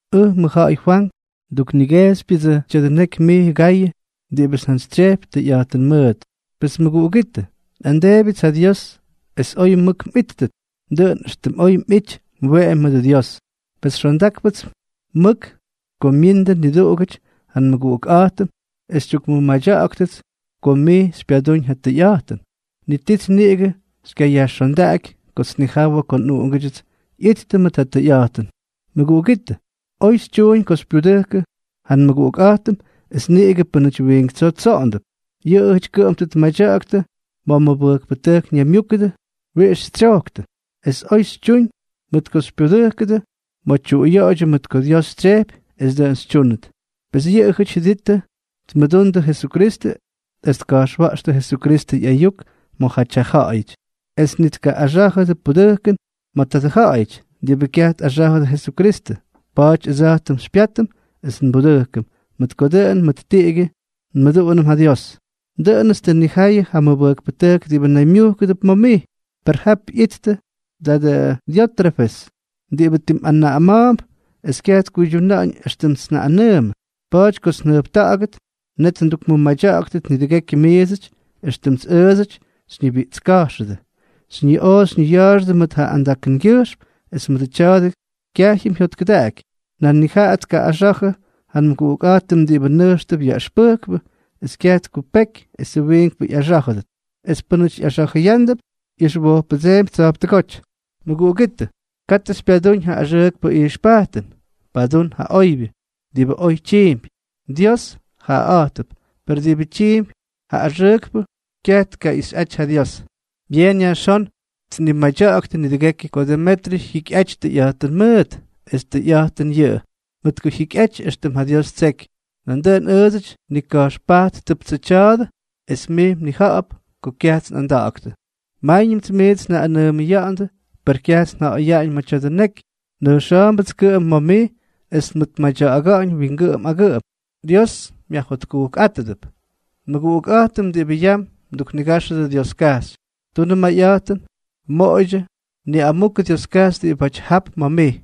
Ʉj mʉjja̱ꞌa̱y Fwank. Nduknigejxypyʉdsʉ tya̱dʉ neky mij, Gayʉ diꞌibʉts njantsytsyejpy tʉyꞌa̱jtʉn mʉʉt. Pes mʉguꞌugítʉ, nꞌamdeebyʉts ja Dios es oy mʉk mꞌítʉt, dʉꞌʉn éxtʉm oy mꞌity mweꞌemy mʉdʉ Dios. Pes xondákpʉts mʉk ko myiindʉ niduꞌugʉty ja nmʉguꞌukꞌa̱jtʉm es xytyukmʉmadya̱ꞌa̱ktʉts ko mij xypyadúñ ja tʉyꞌa̱jtʉn. Ni tits niꞌigʉ xykyayajxondaꞌaky kots nnijawʉ ko nꞌuꞌungʉdyʉts ꞌyittʉ ma̱ ja tʉyꞌa̱jtʉn. Mʉguꞌugítʉ, oy xytyuñ ko xypyudʉkʉ ja nmʉguꞌukꞌa̱jtʉm, es niꞌigʉ pʉ́nʉty wiink tsoo tsoꞌondʉp. Yʉꞌʉjʉty kʉꞌʉm tʉ tmadya̱ꞌa̱ktʉ ma̱ mʉbʉjkpʉtʉjk ñaymyúkʉdʉ wiꞌix xytsyojktʉ. Es oy xytyuñ mʉt ko xypyudʉ́kʉdʉ ma̱ tyuꞌuyoꞌoydyʉ, mʉt ko Dios tsyejpy es dʉꞌʉn xytyúnʉt. Pes yʉꞌʉjʉty jyʉdittʉ tmʉdundʉ Jesukristʉ es tka̱jxwa̱ꞌxtʉ Jesukristʉ ꞌyayuk ma̱jaty ja ja̱ꞌa̱yʉty, es ni tkaꞌꞌaxá̱jʉdʉ pudʉjkʉn ma̱ tadʉ ja̱ꞌa̱yʉty diꞌibʉ kyaj tꞌaxá̱jʉdʉ Jesukristʉ. Pa̱a̱ty ʉdsa̱jtʉm xypyátʉm es nbudʉjkʉm, mʉt ko dʉꞌʉn mʉʉt tiꞌigyʉ nmʉduꞌunʉm ja Dios. Dʉꞌʉnʉts tʉ nnijayʉ ja mʉbʉjkpʉtʉjk diꞌibʉ naymyujkʉdʉp ma̱ mij, per jap ꞌyityʉ tadʉ Diótrefes diꞌibʉ timꞌanaꞌama̱a̱mp es kyaj tkuydyuna̱ꞌa̱ñ éxtʉmts njaꞌꞌanʉʉmʉ. Pa̱a̱ty kots njʉjpta̱ꞌa̱gʉt, net ndukmʉmadya̱ꞌa̱ktʉt nidʉgekyʉ miidsʉty éxtʉmts ʉʉdsʉty xyñibiꞌtska̱jxʉdʉ, xyñiꞌoo xyñiya̱a̱xʉdʉ mʉt ja andakʉngyʉjxm; es mʉdʉ tya̱a̱dʉ kyajyʉm jyotkʉdaꞌaky, nan ni jaꞌa tkaꞌꞌaxa̱jʉ ja nmʉguꞌukꞌa̱jtʉm diꞌibʉ nʉjxtʉp yaꞌʉxpʉjkpʉ, es kyaj tkupeky esʉ wiinkpʉ ꞌyaxá̱jʉdʉt. Es pʉnaty ꞌyaxa̱jʉyándʉp, ꞌyʉxwojppʉdseempy tsa̱jptʉgóty. Mʉguꞌugítʉ, katʉ xypyadúñ ja axʉʉkpʉ ijxpajtʉn. Padún ja oybyʉ. Diꞌibʉ oy tyiimpy, Dios jaꞌaꞌa̱jtʉp; per diꞌibʉ tyiimpy ja axʉʉkpʉ, kyaj tkaꞌixyꞌaty ja Dios. Byeen yajxón tnimadya̱ꞌa̱ktʉ nidʉgekyʉ ko Demetryʉ jyikyꞌaty tʉyꞌa̱jtʉn mʉʉt. Es tʉyꞌa̱jtʉn yʉꞌʉ, mʉt ko jyikyꞌaty éxtʉm ja Dios ttseky. Nandʉꞌʉn ʉʉdsʉty nnika̱jxpajttʉptsʉ tya̱a̱dʉ, es mij mnija̱ꞌa̱p ko kyajts nꞌanda̱ꞌa̱ktʉ. Máyñʉmts miits njaꞌꞌanʉʉmʉya̱ꞌa̱ndʉ, per kyajts nja̱ꞌa̱yaꞌañ ma̱ tya̱dʉ neky, nʉjxa̱a̱mbʉts kʉꞌʉm ma̱ mij es nmʉtmadya̱ꞌa̱ga̱ꞌa̱ñ wingʉꞌʉm agʉꞌʉm. Dios myajjotkujkꞌátʉdʉp. Nmʉguꞌukꞌa̱jtʉm diꞌibʉ yam mduknigáxʉdʉ Dioskajxy. Tunʉ mayꞌa̱jtʉn, moꞌoydyʉ niꞌamukʉ Dioskajxy diꞌibáty jap ma̱ mij.